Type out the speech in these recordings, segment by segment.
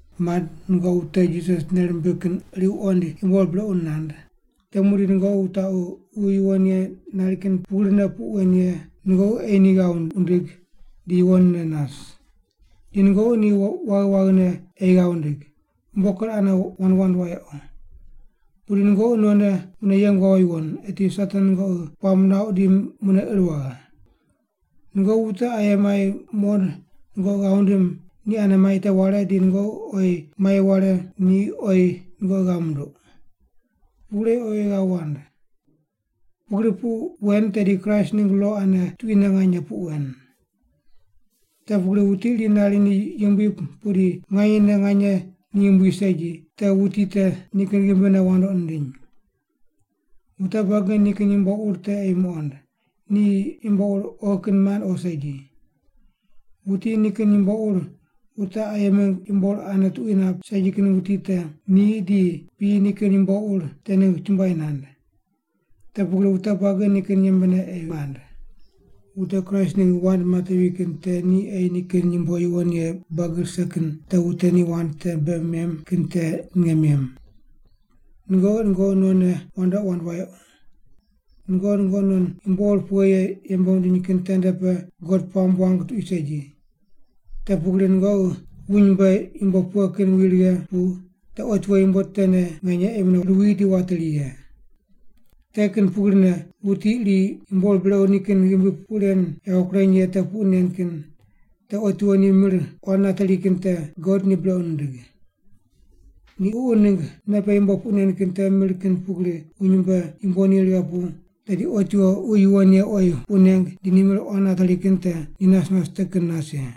Mand, nungoqi wute Jisas nei rimbig kin iri wuqoind yumbo ur brequ nand, te muqdi nungoqi wutaqu Ququ Yuwon Ye nari kin pugrine puq wen ye nungoqi ei ni ghav wundig di yuwonne nas. Di nungoqi ni waghi waghine ei ghav wundig, umbo ker ane wand wand wayequ. Pudi nungoqi nonne mune yeng wawo yuwon, eti Satan nungoqi puamb nuauq di mune ir waghe. Nungoqi wute aye mai muqond nungoqi ghav wundim ni ane mai te ware di nungoqi oyi mai ware ni oyi nungoqi ghav munduq. Pugri ei oyi oyi ghav wand. Pugri puq wen tedi Kraist ningg lo ane tuquine nganye puq wen. Te pugri wuti iri nari ni yumbui pudi nganyene nganye ni yumbui segi, te wuti te nikin ghimbine wandoqi nindiny. Wute buagi nikin yumbo ur te ei muqond, ni yumbo ur oghi kin mand o segi. Wuti nikin yumbo ur wute aye mingg yumbo ur ane tuqui nap segi kin wuti te ni di piyi nikin yumbo ur te ningg chumbuai nand. Te pugri wute buagi nikin yembene ei mand. Wute Kraist ningg wand matevi kin te ni ei nikin yumbo yuwon ye buagi rise kin te wute ni wand te bei mem kin te ninge mem. Nungoqi nungoqi nonne wandoqi wand wayequ. Nungoqi nungoqi non yumbo ur pughe ye yembe wundiny kin tende pe God puamb wang tuqui segi. Te pugri nungoqi wuny mbe yumbo pughe kin wi righe pu te otiwo yumbo tene nganye ei mune ruwi di wateri ye. Te kin pugrine wuti iri yumbo ur brequ nikin ghimbi puq ren yawo kureny ye te puq nen kin te otiwo ni mir quan nateri kin te God ni brequ nindig. Ni Ququ ningg nei pe yumbo puq nen kin te mir kin pugri wuny mbe yumbo ni righe pu tedi otiwo Ququ Yuwon Ye oyi puq neng di ni mir quan nateri kin te ni nas nas te kin nas ye.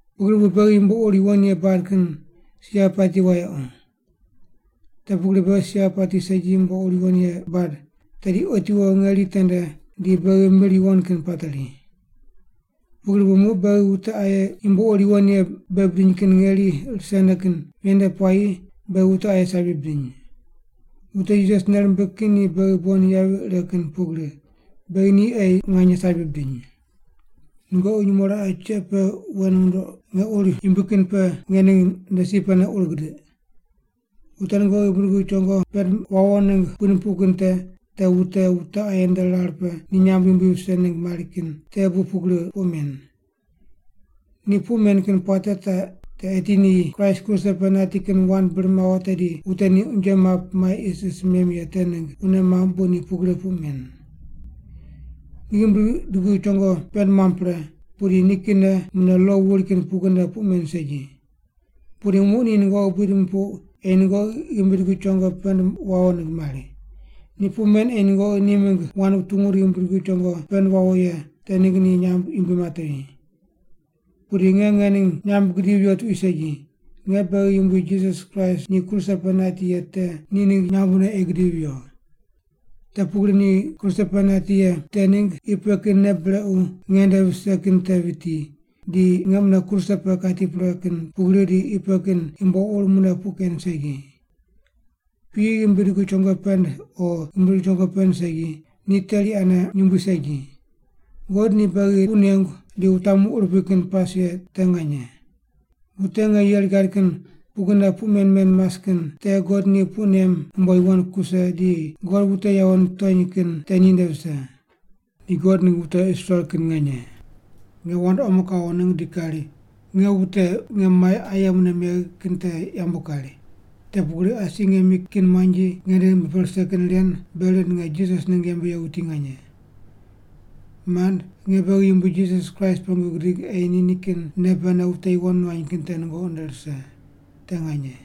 Pugri bu beghi yumbo ur yuwon ye bad kin si yavi pati wayequ. Te pugri beghi si yavi pati segi yumbo ur yuwon ye bad tedi otiwo ngeri tende di beghi mir yuwon kin pateri. Pugri bu muq beghi wute aye yumbo ur yuwon ye bei bidiny kin ngeri risene kin ven nde puayi beghi wute aye sabi bidiny. Wute Jisas nei rimbig kin ni beghi bon yavi ire kin pugri, beghi ni ei nganye sabi bidiny. Nungoqi nyumo raqe cheq pe wen wundoq nge ur yumbui kin pe nge ning nde si pene ur gidiq. Wute nungoqi ghimbi dugu chongo pend wawo ningg buid mupuq kin te, te wute wute aye nde rar pe ni nyamb yumbui vise ningg mari kin te bu pugri puq men. Ni puq men kin puate taq te eti ni Kraist kruse pe nati kin wand bir mawo tedi wute ni unje map mai isis mem ye te ningg wune mamb bu ni pugri puq men. Ni ghimbi dugu chongo pend muam pre, pudi nikinne mune lo wuri kin pugrine puq men segi. Pudi muq ni nungoqi buid mupuqu ei nungoqi ghimbi dugu chongo pend wawo ningg mari. Ni puq men ei nungoqi ni mingg wand wutungu di ghimbi dugu chongo pend wawo ye te ningg ni nyamb yumbui matevi. Pudi nge ngening nyamb gidivi viyo tuqui segi, nge beghi Yumbui Jisas Kraist ni kruse pe nati ye te ni ningg nyambne ei gidivi viyo. Te pugri ni kruse pe nati ye te ningg qi pe kin nei brequ nge nde vise kin te viti, di nge mune kruse pe kati pre kin pugri di qi pe kin yumbo ur mune puq ken segi. Piyi ghimbi dugu chongo pend o ghimbi dugu chongo pend segi, ni teri ane yumbui segi. God ni beghi puq nengu di wutamu urupui kin pas ye te nganye. Wute nge yeri gad kin pugrine puq men men mas kin te God ni puq nem umbo yuwon kuse di God wute yawo nitony kin te ninde vise. Ni God ningg wute Israel kin nganye. Nge wand omo kawo ningg di kari, nge wute nge mai aye mune megh kin te yambu kari, te pugri asi nge mi kin muanji nge nde ghimbi pe rise kin ren bei rind nge Jisas ningg yembe ye wuti nganye. Mand, nge beghi Yumbui Jisas Kraist pengu gidig ei nikin nei pene wute yuwon nuany kin te nungoqi nde rise. Te nganye.